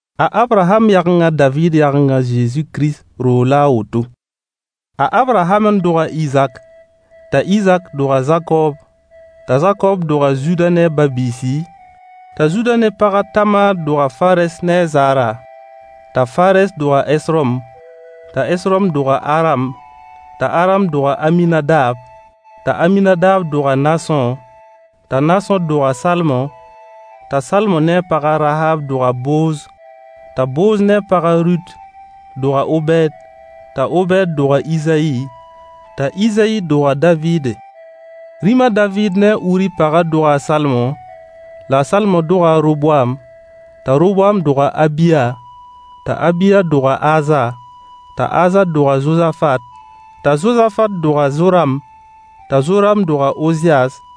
A Abraham yageng a David yageng a Zezi Kirist roog la a woto. A Abraham n dog a Izak, t'a Izak dog a Zakob, t'a Zakob dog a Zuda ne a ba-biisi, t'a Zuda ne pag a Tamaar dog a Farɛs ne a Zaara, t'a Farɛs dog a Hesrom, t'a Hesrom dog a Aram, t'a Aram dog a Aminadab, t'a Aminadab dog a Naasõ, t'a Naasõ dog a Salmo, t'a Salmo ne a pag a Rahaab dog a Booz, t'a Booz ne a pag a Rut dog a Obɛɛd, t'a Obɛɛd dog a Izayi, t'a Izayi dog a David. Rĩm a David ne a Uri pagã doga a Salomo, la a Salomo doga a Roboam, t'a Roboam dog a Abiya, t'a Abiya dog a Aza, t'a Aza dog a Zozafat, t'a Zozafat dog a Zoram, t'a Zoram dog a Oziyas,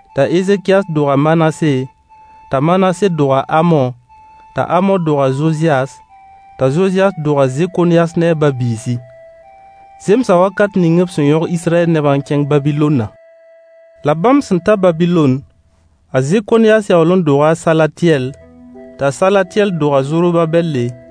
t'a Ezekiyas dog a Manase, t'a Manase dog a Amo, t'a Amo dog a Zozɩyas, t'a Zozɩyas dog a Zekonyas ne a ba-biisi. Zemsa wakat ning b sẽn yõg Israyɛl nebã n kẽng Babilonnã. La bãmb sẽn ta Babilon, a Zekonyas yaool n doga a Salatyɛl, t'a Salatyɛl dog a Zorobabɛlle,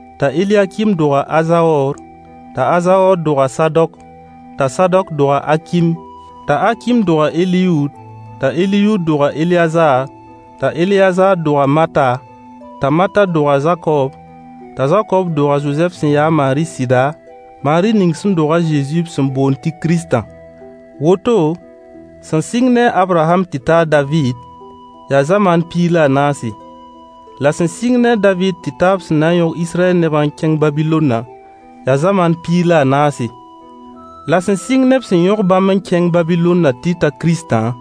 t'a Eliyakim dog a Azaoor, t'a Azaoor dog a Sadok, t'a Sadok dog a Akim, t'a Akim dog a Eliyuud, t'a Eliyuud dog a Eleyazaar, t'a Eleyazaar dog a Mata, t'a Mata dog a Zakob, t'a Zakob dog a Zozɛf sẽn ya a Maari sɩda, Maari ning sẽn dog a Zezi b sẽn boond tɩ Kiristã. Woto, sẽn sɩng ne a Abraham tɩ ta a David, yaa zamaan piig la a naase. La sẽn sɩng ne a David tɩ ta b sẽn na n yõg Israyɛll nebã n kẽng Babilonnã, yaa zamaan piig la a naase. La sẽn sɩng ne b sẽn yõg bãmb n kẽng Babilonnã tɩ ta Kiristã,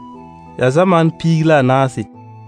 yaa zamaan piig la a naase.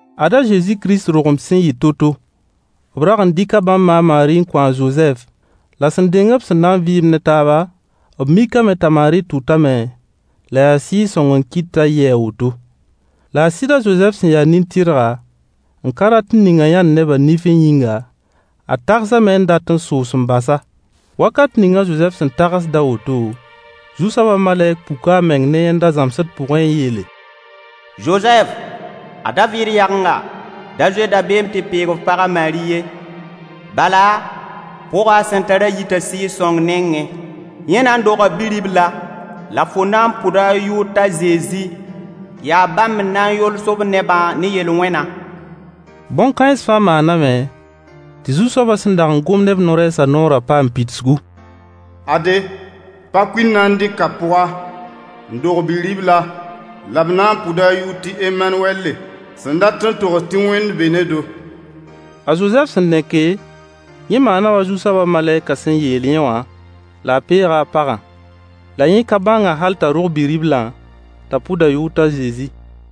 Ad a Zezi Kirist dogem sẽn yɩ to-to: B rag n dɩka bãmb ma a Maari n kõ a Zozɛf, la sẽn deng b sẽn na n vɩɩmd ne taaba, b mikame t'a Maari tʋtame, la yaa Sɩɩg-sõng n kɩt t'a yɩ a woto. La a sɩd a Zozɛf sẽn ya nin-tɩrga, n ka rat n ning-a yãnd neb nifẽ yĩnga, a tagsame n dat n soos n bas-a. Wakat ning a Zozɛf sẽn tagsd a woto, Zu-soabã malɛk puka a meng ne yẽnda zãmsd pʋgẽ n yeele: Zozɛf, a David yagenga, da zoe dabeem tɩ peeg f pag a Maari ye, bala pʋgã a sẽn tarã yita Sɩɩg-sõng nengẽ. Yẽ na n doga bi-ribla, la fo na n pʋda a yʋʋr t'a Zezi. Yaa bãmb n na n yols b nebã ne yel-wẽnã. Bõn-kãens fãa maaname tɩ Zu-soabã sẽn dag n gom ne b no-rɛɛsã noorã paam pidsgu: Ade, pa-kuil na n dɩka pʋga, n dog bi-ribla, la b na n pʋda a yʋʋr tɩ Emanuwɛlle, sẽn dat n togs tɩ Wẽnd be ne-do. A Zozɛf sẽn neke, yẽ maana wa Zu-soabã malɛkã sẽn yeel yẽ wã, la a peega a pagã. La yẽ ka bãng-a hal t'a rog bi-riblã, t'a pʋd a yʋʋr t'a Zezi.